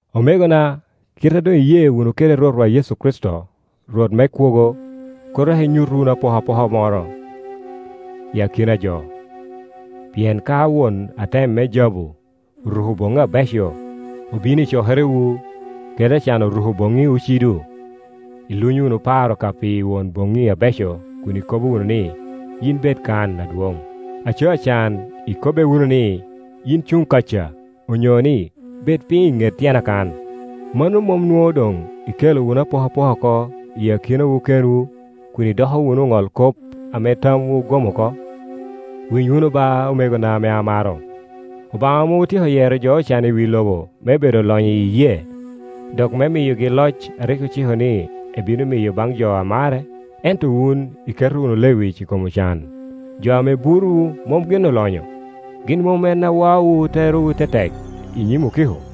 Omegona, kite a doŋ iye wunu kede Rwotwa Yecu Kricito, Rwot me kwogo, kur dok inyut wunu apokapoka moro i akina a jo. Pien ka won atem me jabu oruko boŋŋi abeco obino i cokerewu, kede acan oruko boŋŋi ocido, ilunyo wunu paro ka pi won boŋŋi abeco kun ikobo wunu ni, “Yin bed kan, adwoŋ”, aco acan ikobbe wunu ni, “Yin cuŋ kaca”, onyo ni, “Bed piny i ŋet tyena kan”. Mano mom nwoŋo doŋ ikelo wunu apokapoka oko i akinawu kenwu, kun idoko wunu oŋolkop ame tamwu ogom oko? Winy wunu ba, omegona ame amaro, Obaŋa mom otyeko yero jo ocan i wi lobo me bedo olonyo i iyee, dok me miyogi loc a rik ociko ni ebino miyo baŋ jo a mare? Ento wun iketo wunu lewic i kom ocan. Jo ame burowu, mom gin olonyo? Gin mom en a waowu terowu tetek i nyim okiko?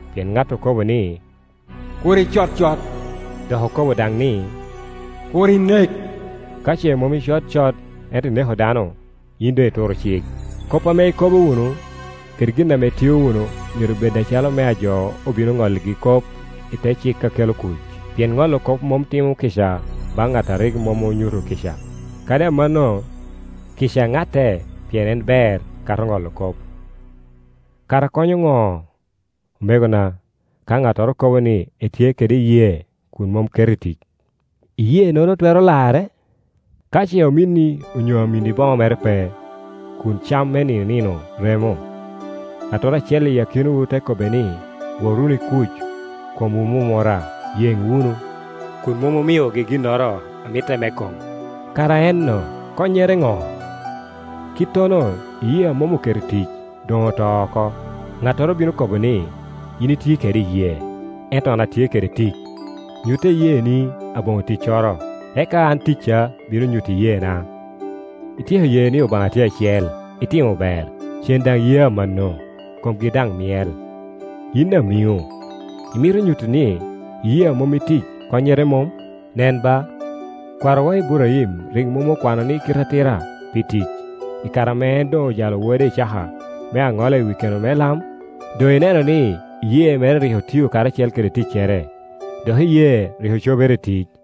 Pien ŋat okobo ni, “Kur icod cot,” dok okobo daŋ ni, “Kur inek.” Ka ce mom icod cot ento ineko dano, yin doŋ ituro cik. Kop ame ikobo wunu, kede gin ame itio wunu, myero bed acalo mea jo obino ŋolligi kop i te cik a kelo kuc. Pien ŋolo kop mom timo kica baŋ ŋat a rik mom onyuto kica; kadi amanno, kica ŋatte pien en ber kato ŋolo kop. Kara konyo ŋo omegona, ka ŋattoro kobo ni etye kede iyee kun mom keto i tic? Iyee-nono twero lare? Ka ce ominni onyo aminni boŋo mere pe, kun cam me nino i nino remo, ŋattoro acel i akinawu te kobbe ni, “Wot wunu i kuc, komwu mumura, yeŋ wunu,” kun mom omiogi ginnoro a mitte me kom, kara enno konyere ŋo? Kittono, iyee a mom oketo i tic, doŋ oto oko, ŋattoro bino kobo ni, “Yin itye kede iyee, ento an atye kede tic; nyutta iyeeni aboŋo ticcoro, eka an ticca bino nyuto iyeena.” Ityeko ye ni Obaŋa tye acel, itimo ber. Cen daŋ ye amanno, komgi daŋ myel. Yin amiŋo, imito nyutti ni, iyee a mom i tic konnyere mom? Nen ba, kwarowa Iburaim rik mom okwano ni kite atira pi tic, i kare ame en doŋ ojalo wode Icaka me aŋola i wi keno me lam? Doŋ ineno ni iyee mere rik otio karacel kede ticcere, dok iyee rik ocobere i tic,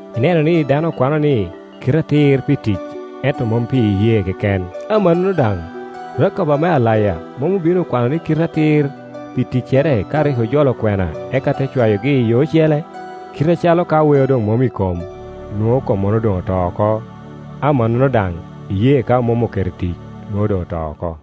Ineno ni dano okwano ni kite atir pi tic ento mom pi iyee keken. Amannono daŋ, Rakab ame alaya, mom obin okwano ni kite atir pi ticcere, ka rik ojolo okwena eka te cwayogi i yo ocele? Kite acalo ka weo doŋ mom i kom, nwoŋo kommono doŋ oto oko, amannono daŋ, iyee ka mom oketo i tic, nwoŋo doŋ oto oko.